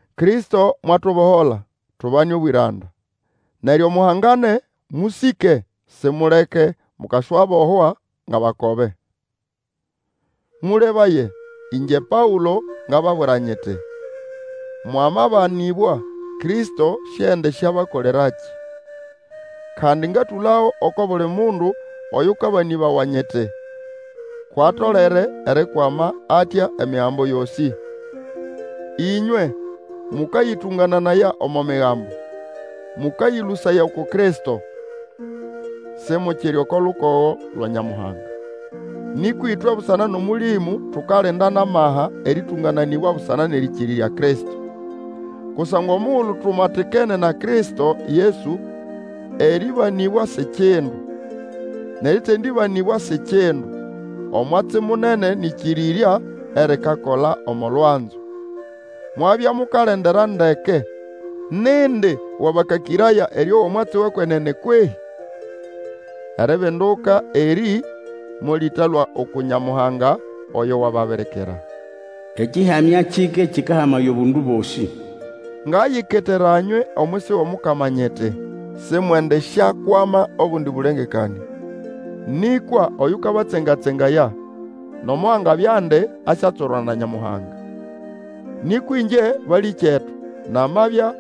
Kristo mwatubohola, tubane obwĩranda! Neryo muhangane, mũsĩke, simuleke mukaswabohwa ngʼabakobe. Mũlebaye! Ĩngye Paũlo, ngababwira nyiti, Mwamabanĩbwa, Kristo siendisyabakolerakĩ. Kandi, ngatũlago, oko buli mundu oyũkabanĩbawa nyiti, kwʼatolere erikwama atya Emigambo yosĩ. Ĩnywe mũkayĩtũngananaya omo Migambo, mũkayĩlũsaya uku Kristo. Simukiri oko lukogo lwa Nyamuhanga. Nĩkwa ĩtwe busana nʼOmũlĩmũ tukalinda nʼamaha erĩtũngananĩbwa busana nʼerĩkĩrĩrya Kristo. Kusangwa omugulu tumatikene na Kristo Yesu, erĩbanĩbwa si kindu. Nʼerĩ tendĩbanĩbwa si kindu. Omwatsi munene nĩʼkĩrĩrya erikakola omo lwanzo. Mwabya mukalendera ndeke; nindi wabakakĩraya erĩowa omwatsi wʼekwenene kwehĩ? Eribinduka erĩ molĩtalũa uku Nyamuhanga, oyo wababirikira. Ekĩhamya kike kĩkahamaya obundu bosĩ. Ngayiketera nywe omwisi wʼOmukama nyiti, simwendisyakwama obundi bũlengekanĩa. Nĩkwa oyũkabatsenga-tsengaya nomo angabyandi asyatswerwa na Nyamuhanga. Nĩkwa ĩngye, balĩkyetu, namabya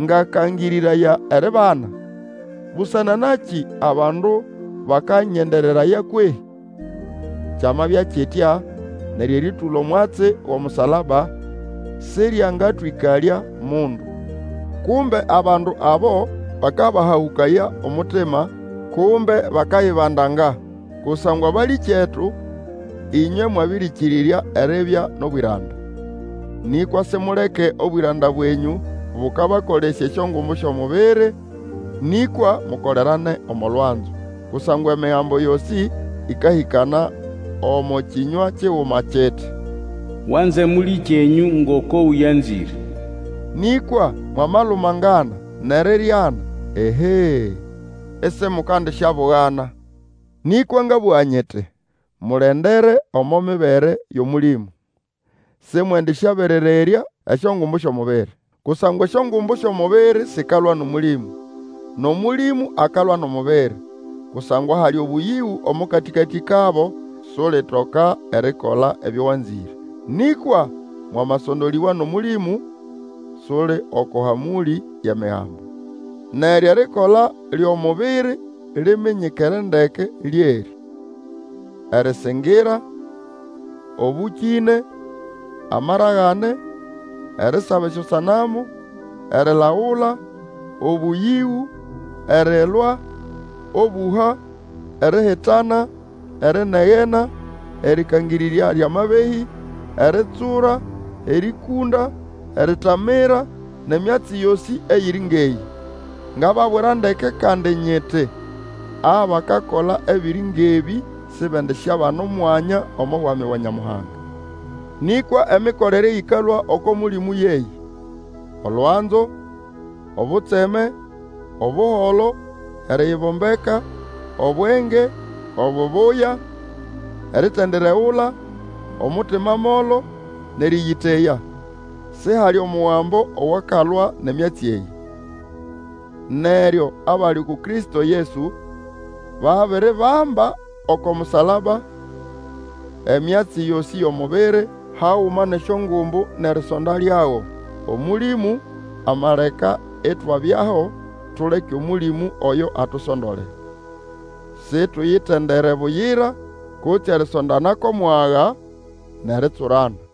ngakangĩrĩraya eribana, busana nakĩ abandu bakanyendereraya kwehĩ? Kyamabya kitya neryo erĩtũla omwatsi wʼomusalaba sĩryangatwĩkalya mundu. Kumbe abandu abo bakabahahũkaya omutima, kumbe bakayibandanga. Kusangwa balĩkyetu, ĩnywe mwabĩrĩkĩrĩrya eribya nʼobwĩranda. Nĩkwa simuleke obwĩranda bwenyũ bũkabakolesya esyongumbu syʼomubiri; nĩkwa mukolerane omo lwanzo. Kusangwa Emigambo yosĩ ĩkahĩkana omo kĩnywa kiguma kiti, Wanze mũlĩkyenyũ ngoko ũyanzĩre. Nĩkwa mwamalumangana nʼeriryana, ehee, isimukandisyabugana! Nĩkwa ngabũga nyiti, Mulendere omo mibere yʼOmũlĩmũ, simwendĩsyaberererya esyongumbu syʼomubiri. Kusangwa esyongumbu syʼomubiri sikalwa nʼOmũlĩmũ, nʼOmũlĩmũ akalwa nʼomubiri; kusangwa hali obũyĩgũ omo katĩkatĩ kabo, sulitoka erikola ebyo wanzĩre. Nĩkwa mwamasondolĩbwa nʼOmũlĩmũ, suli oko hamũlĩ yʼEmigambo. Neryo erikola lyʼomubiri liminyikere ndeke, lyerĩ: erĩsĩngĩra, obũkĩne, amaragane, erisaba esyosanamu, erilagula, obũyĩgũ, erilwa, obũha, erihitana, erinegena, erĩkangĩrĩrya lyʼamabehĩ, eritsura, erĩkũnda, eritamira, nʼemyatsi yosĩ eyiri ngʼeyĩ. Ngababwira ndeke kandi nyiti, abakakola ebiri ngʼebĩ sibendisyabana omwanya omo Bwami bwa Nyamuhanga. Nĩkwa emikolere eyĩkalũa oko Mũlĩmũ yeyĩ: olwanzo, obutseme, Obuholo, eriyibombeka, obwenge, obubuya, eritendiregula, omutima molo, nʼerĩyĩteya. Sihali omugambo owakalwa nʼemyatsi eyĩ. Neryo abali uku Kristo Yesu babiribamba oko musalaba emyatsi yosĩ yʼomubiri, haguma nʼesyongumbu nʼerisonda lyago. Omũlĩmũ amaleka itwabyaho, tuleke Omũlĩmũ oyo atusondole. Situyitendere buyira, kutse erisondana kwʼomwaga, nʼeritsurana.